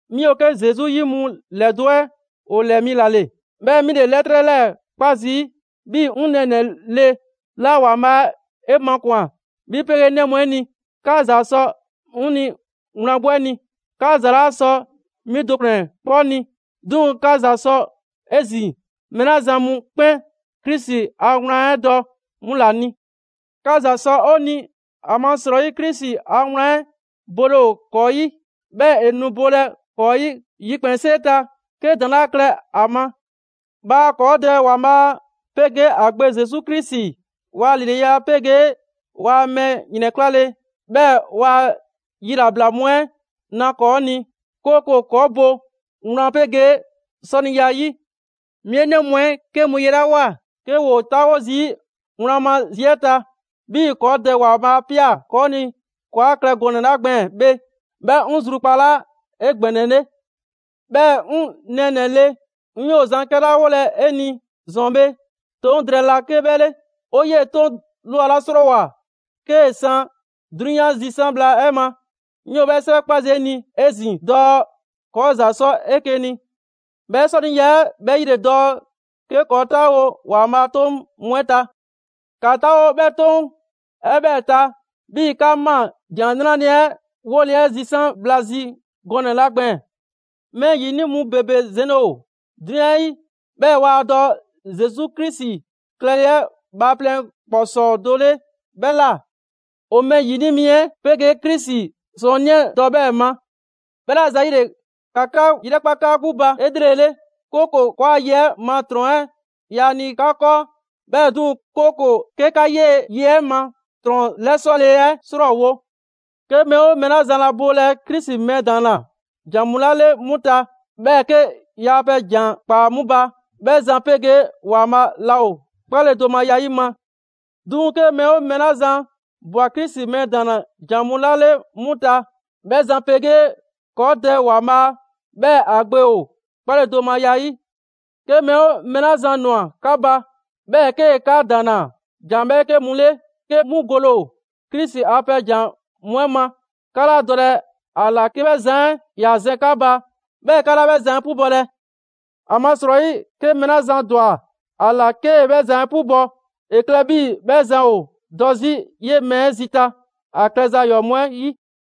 'Mi ‑o 'ke Zesu 'yi mu ‑lɛdo' 'ɛ ‑o ‑lɛɛ mi ‑la ‑le, 'bhɛɛ‑ 'mi ‑le 'lɛtrɛ 'lɛɛ‑ 'kpa zii' 'bhi 'ŋ nɛɛnɛ‑ le 'la ‑Waanbhaa' 'e makwan‑, 'bhi 'pegee 'e 'nɛ mu 'ɛ ni. 'Ka ‑za sɔ 'ŋ ni wlan 'gbu 'ɛ ni. 'Ka ‑za 'laa sɔ 'mi do ‑kplɛn 'kpɔ ni, 'duŋ‑ 'ka ‑za sɔ 'ezin‑ mɛɛ 'la zan mu 'kpɛn Krisi a wlan 'ɛ dɔ 'mu ‑la ni. 'Ka ‑za sɔ 'o ni, ‑amasrɔyi Krisi a wlan 'ɛ bole ‑o ‑kɔɔ' 'yi, 'bhɛɛ‑ ‑e nu bolɛ ‑kɔɔ' 'yi yikpɛnsee ta 'ke ‑daŋ' 'laa klɛ ‑a ma. Bhaa ‑kɔɔ Dɛ ‑Waanbhaa' 'pegee ‑a Gbe Zesu Krisi ‑waa' ‑lileya 'pegee waa mɛɛ ‑yrɛnklale, 'bhɛɛ‑ ‑waa' yilabla mu 'ɛ na ‑kɔɔ' ni, 'kooko‑ ‑kɔɔ' bo wlan 'pegee 'sɔniya 'yi. 'Mi 'e 'nɛ mu 'ɛ 'ke mu yelewao 'ke ‑woo 'taawo zii' wlan ma zi 'ɛ ta, 'bhii‑ ‑kɔɔ Dɛ ‑Waanbhaa' 'a ꞊pia ‑kɔɔ' ni ‑kɔɔ' 'a klɛ gɔnɛ‑ 'la gbɛɛn‑ bhe, 'bhɛ 'ŋ zrukpalaa 'egbɛnɛle. 'Bhɛɛ‑ 'ŋ nɛɛnɛ‑ le, 'ŋ 'yoo zan 'kɛla 'wolɛ‑ 'e ni ‑zɔn bhe, 'Toŋ drɛɛ 'laa 'ke 'bhɛ le. 'O 'yee‑ 'Toŋ ꞊lwa 'la 'srɔɔwoa‑ 'kee‑ 'san 'drunyan zisan' bhla 'ɛ ma, 'ŋ 'yoo 'bhɛɛ‑ 'sɛwɛ 'kpa zii' 'e ni 'ezin‑ dɔɔ: ‑kɔɔ ‑za 'sɔ 'eke‑ ni. 'Bhɛɛ‑ 'sɔniya 'ɛ 'bhɛ 'yi ‑le dɔɔ 'ke ‑kɔɔ' 'taawo‑ ‑Waanbhaa' a 'toŋ mu 'ɛ ta. ‑Ka 'taawo 'bhɛ 'Toŋ 'ɛ 'bhɛɛ‑ ta 'bhii‑ 'kaa ꞊maa ‑Jan 'Nrale‑ 'ɛ 'wole 'ɛ zisan' bhla zi gɔnɛ‑ 'la gbɛɛn‑. Mɛɛ ‑yini' mu ‑bebe zɛnle ‑o 'drunyan 'ɛ 'yi; 'bhɛɛ‑ waa dɔ Zesu Krisi klɛle 'ɛ bhaaplɛŋ ‑kpɔsɔɔ do 'le 'bhɛ ꞊la. ‑O mɛɛ ‑yini' mi 'ɛ 'pegee Krisi 'Sɔɔnnii 'ɛ dɔ 'bhɛɛ ma. 'Bhɛla‑ ‑zayile, ‑ka 'ka 'yrɛkpa 'ka 'gbu ba 'elrele; 'kooko‑ ‑kɔɔa' ye 'ɛ ma ‑trɔn 'ɛ yaa ni 'ka 'kɔɔ, 'bhɛɛ‑ 'duŋ‑, 'kooko‑ 'ke 'ka 'yee‑ ye 'ɛ ma ‑trɔn 'lɛsɔle 'ɛ ‑srɔɔwo'. 'Ke mɛɛ 'oo mɛɛ 'la zan laa bolɛ Krisi mɛɛ ‑daanna ‑jan mu 'la 'le 'mu ta, 'bhɛɛ‑ 'kee‑ yaa pɛ ‑jan ꞊kpaa 'mu ba; 'bhɛ zan 'pegee ‑Waanbhaa' laa ‑o 'kpaledomaya 'yi ma. 'Duŋ‑ 'ke mɛɛ 'oo mɛɛ 'la zan ꞊bwa Krisi mɛɛ ‑daanna ‑jan mu 'la 'le 'mu ta, 'bhɛ zan 'pegee ‑kɔɔ' Dɛ ‑Waanbhaa', 'bhɛɛ‑ ‑a Gbe ‑o 'kpaledomaya 'yi. 'Ke mɛɛ 'oo mɛɛ 'la zan ‑nwa 'ka ba, 'bhɛɛ‑ 'kee‑ 'ka ‑daanna ‑jan 'bhɛɛke mu 'le 'ke 'mu gole ‑o Krisi a pɛ ‑jan mu 'ɛ ma, 'ka 'laa dɔlɛ ‑a ‑la 'ke 'bhɛ zan 'ɛ ‑ya zɛn 'ka ba; 'bhɛɛ‑ 'ka 'laa 'bhɛ zan 'ɛ 'pubɔlɛ. ‑Amasrɔyi, 'ke mɛɛ 'la zan ‑dwa ‑a ‑la 'kee‑ 'bhɛ zan 'ɛ 'pubɔ, ‑e klɛ 'bhii‑ 'bhɛ zan ‑o dɔ 'zi 'yee‑ mɛɛ 'ɛ zita ‑a klɛza ‑yɔɔ' mu 'ɛ 'yi.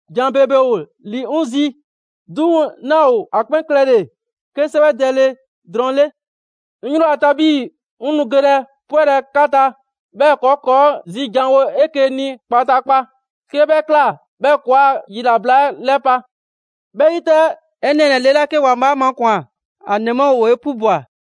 ‑Jan ‑bebe ‑o ‑li 'ŋ zi, 'duŋ‑ 'naa ‑o ‑a 'kpɛn klɛle‑ 'ke 'sɛwɛdɛle drɔŋ 'le. 'Ŋ 'yri ‑o ta 'bhii‑ 'ŋ nu gelɛ 'pwɛlɛ‑ 'ka ta, 'bhɛɛ‑ ‑kɔɔ' ‑kɔɔ' zi janwo 'eke‑ ni kpataakpa. 'Ke 'bhɛ ꞊kla, 'bhɛɛ‑ ‑kɔɔa' yilabla 'ɛ 'lɛpa‑. 'Bhɛ 'yi 'tɛ, 'e nɛɛnɛ‑ le 'la 'ke ‑Waanbhaa' 'a makwan‑, ‑a ‑nɛ mu 'ɛ ‑woo 'e 'pubwa‑.